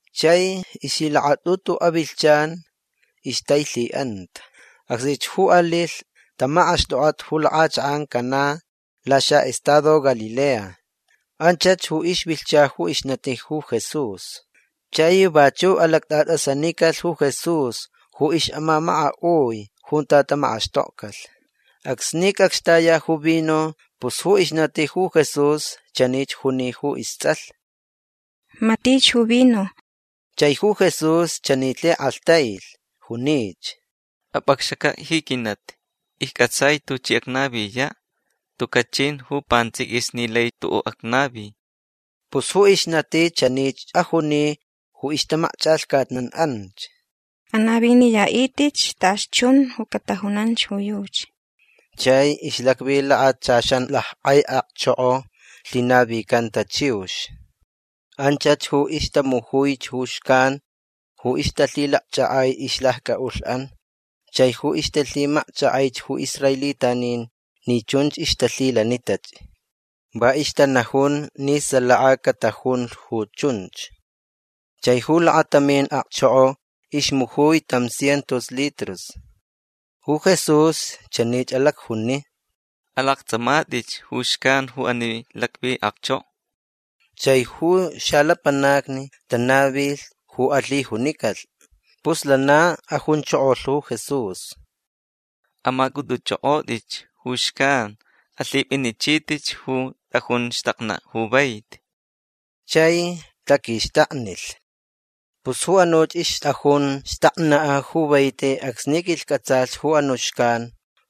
Chai ixlhilakatʼutu avilhchan ixtailhiʼanta. Acsnich ju alilhch tamakʼaxtʼokʼat ju lakʼachakʼan Caná laxaʼestado Galilea. Anchach ju ixvilhcha ju ixnati ju Jesús. Chai vachuʼ alactʼatʼasanicalh ju Jesús ju ixʼamamakaʼui junta tamakʼaxtokcalhch. Acsni cʼacxtaya ju vino pus ju ixnati ju Jesús chanich juni ju istsʼalh: ―Matich ju vino. Chai ju Jesús chani lhikʼalhtailh. Junich: ―Apʼacxacaʼ ji quinati. Iccʼatsaich tuchi acnaviyaʼ. Tucaʼ chin ju pantsʼiquis ni lai tuʼuʼ acnavi. Pus ju ixnati chanich ajuni ju ixtamakchʼalhcatnan anch: ―Anaviniyaʼitʼitch tachi chun ju catajunanch ju yuchi. Chai ixlacvi lakachaxan lackʼai akchoko lhinavicanta chiux. Anchach ju ixtamujuich ju xcan ju ixtalhilacchʼakʼai ixlaccʼaʼulhʼan chai ju ixtalhimacchʼakʼaich ju israelitanin ni chunch ixtalhilanitach. Va ixtanajun ni salaka catajunlh ju chunch. Chai ju lakatamin akchoko ixmujui tam cientos litros. Ju Jesús chanich alacjuni: ―Alaktsʼamatʼitch ju xcan ju ani lacvi akchoko. Chai ju xalapanacni tanavilh ju alhijunicalh. Pus lana ajunchokolh ju Jesús: ―Amacʼutʼuchʼokʼotʼitch ju xcan. Alhipʼinichitʼitch ju tʼajun xtaknaʼ ju vaiti. Chai taquixtaknilh. Pus ju anuch ixtʼajun xtaknaʼ ju vaiti acsni quilhcʼatsalh ju anuʼ xcan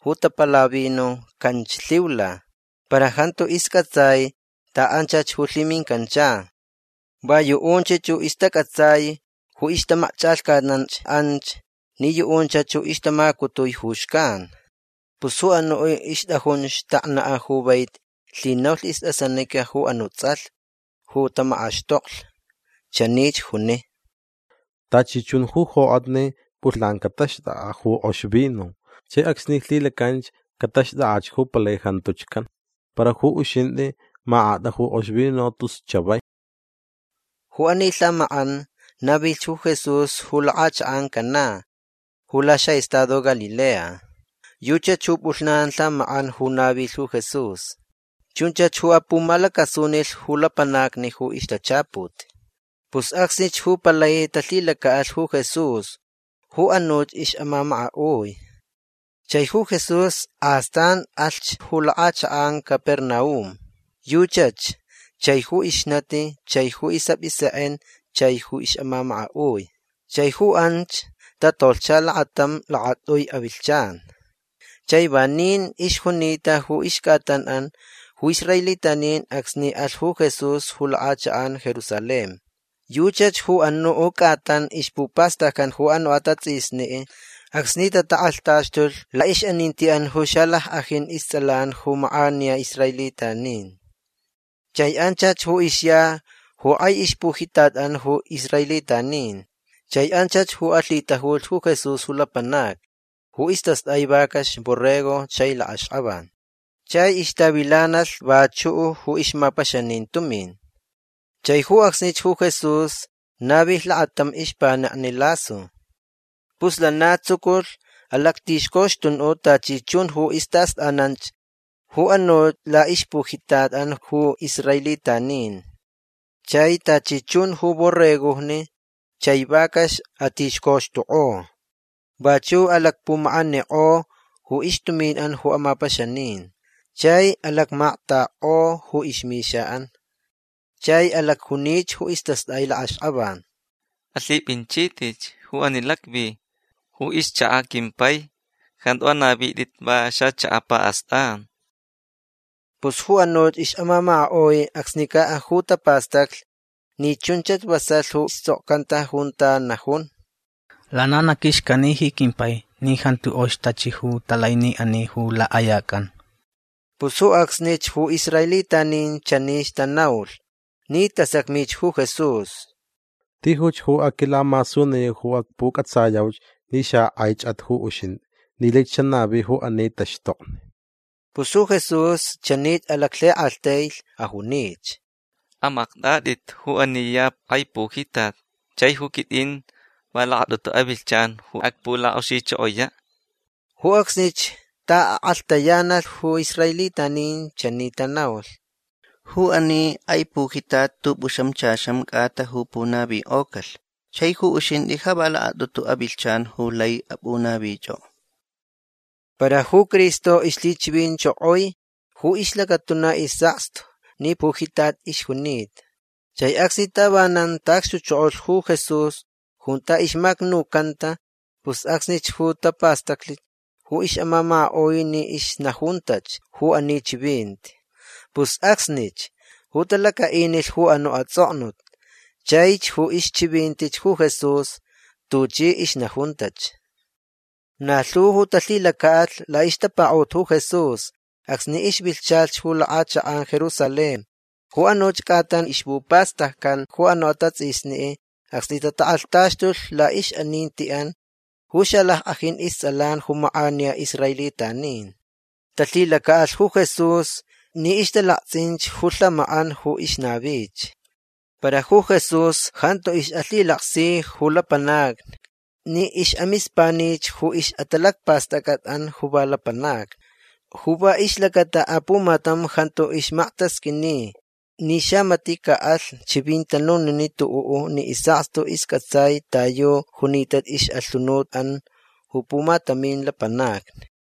ju tapala vino canch lhiula. Para jantu iscʼatsai taʼanchach ju lhimincancha. Va yuʼunch ju ixtacʼatsai ju ixtamakchʼalhcatnanch anch ni yuʼunchach ju ixtamacutui ju xcan. Pus ju anuʼ ixtʼajun xtaknaʼ ju vaiti lhinaulh istʼasanica ju anuʼ tsʼalh ju tamakʼaxtoklh. Chanich juni: ―Tachi chun ju jokʼatni pʼulhnan cataxtʼakʼaʼ ju kʼox vino. Chai acsni lhilacanch cataxtʼakʼach ju palai jantuch can. Para ju uxintʼi makʼatʼa ju kʼox vino tus chavai. Ju ani lhamakʼan navilh ju Jesús ju lakʼachakʼan Caná ju laxaʼestado Galilea. Yuchach ju pʼulhnan lhamakʼan ju navilh ju Jesús. Chunchach ju apumalacasunilh ju lapanacni ju ixtachaput. Pus acsnich ju palai talhilacaʼalh ju Jesús ju anuch ixʼamamakaʼui. Chai ju Jesús astan alhch ju lakʼachakʼan Capernaum. Yuchach chai ju ixnati chai ju isʼapʼisekʼen chai ju ixʼamamakaʼui. Chai ju anch tatolhcha lakatam lakatʼui avilhchan. Chai vanin ixjunita ju ixcʼatanʼan ju israelitanin acsni alh ju Jesús ju lakʼachakʼan Jerusalén. Yuchach ju anuʼ cʼatan ixpupastaccan ju anuʼ atatsʼisni acsni tatakʼalhtaxtulh laʼixʼanintiʼan ju xalackʼajin istsʼalan ju makʼaniya israelitanin. Chai anchach ju ixya ju kʼai ixpujitatʼan ju israelitanin. Chai anchach ju alhitajulhch ju Jesús ju lapanacni ju istastʼai vacax borrego chai lakʼaxkʼavan. Chai ixtavilanalh vachuʼ ju ixmapaxanin tumin. Chai ju acsnich ju Jesús navilh lakatam ixpanekni lasu. Pus lana tsuculh alactixcoxtunuʼ tachi chun ju istaʼastʼananch ju anuʼ laʼixpujitatʼan ju israelitanin. Chai tachi chun ju borregojni chai vacax atixcoxtukʼo. Vachuʼ alacpumakʼanikʼo ju ixtuminʼan ju amapaxanin. Chai alacmaktakʼo ju ixmixaʼan. Chai alacjunich ju istastʼaich lakʼaxkʼavan: ―Alhipʼinchitʼitch ju ani lacvi. Ju ixchakaʼ quimpai jantu anavitʼit va xachakaʼ paʼastʼan. Pus ju anuch ixʼamamakaʼui acsnicaʼ ju tapastacli ni chunchach vasalh ju tsʼokcanta junta najun: “Lana na quixcani ji quimpai ni jantu kʼox tachi ju talai ni ani ju lakʼayacʼan”. Pus ju acsnich ju israelitanin chanich tanaulh ni tasacmich ju Jesús: ―Tijuch ju aquilamasuniyau ju acpucʼatsayauch ni xakʼaichʼat ju uxintʼi ni laich xanavi ju ani taxtokni. Pus ju Jesús chanich alaclhikʼalhtailh. Ajunich: ―Amaktʼatʼit ju ani ya kʼai pujitat. Chai ju quitʼin va lakatʼutu avilhchan ju acpulakʼoxichokoyaʼ. Ju acsnich taʼakʼalhtayanalh ju israelitanin. Chani tanaulh: ―Ju ani kʼai pujitat tʼupʼuxamchaxan cʼata ju punavikʼocalh. Chai ju uxintʼi ja va lakatʼutu avilhchan ju lai apʼunavichʼokʼo. Para ju Cristo ixlhichivinchokoi ju ixlacatuna isʼakstu ni pujitat ixjunita. Chai acsni tavanan taʼacxtuchokolh ju Jesús junta ixmacnucanta pus acsnich ju tapastaclich ju ixʼamamakaʼui ni ixnajuntach ju ani chivinti. Pus acsnich ju talacaʼinilh ju anuʼ atsʼoknut chaich ju ixchivintich ju Jesús tuchi ixnajuntach. Na lhu ju talhilacaʼalh laʼixtapakaʼut ju Jesús acsni ixvilhchalhch ju lakʼachakʼan Jerusalén ju anuch cʼatan ixpupastaccan ju anuʼ atatsʼisni acsni tatakʼalhtaxtulh laʼixʼanintiʼan ju xalackʼajin istsʼalan ju makʼaniya israelitanin. Talhilacaʼalh ju Jesús ni ixtalaktsʼinch ju lhamakʼan ju ixnavich. Para ju Jesús jantu ixʼalhilaksi ju lapanacni ni ixʼamispanich ju ixʼatalacpastʼacʼatʼan ju va lapanacni. Ju va ixlacata apumatam jantu ixmaktasqʼuini ni xamatiʼ caʼalh chivintanuniniʼ tuʼuʼ ni isʼakstu iscʼatsai ta yu junita ixʼalhunutʼan ju pumatamin lapanacni.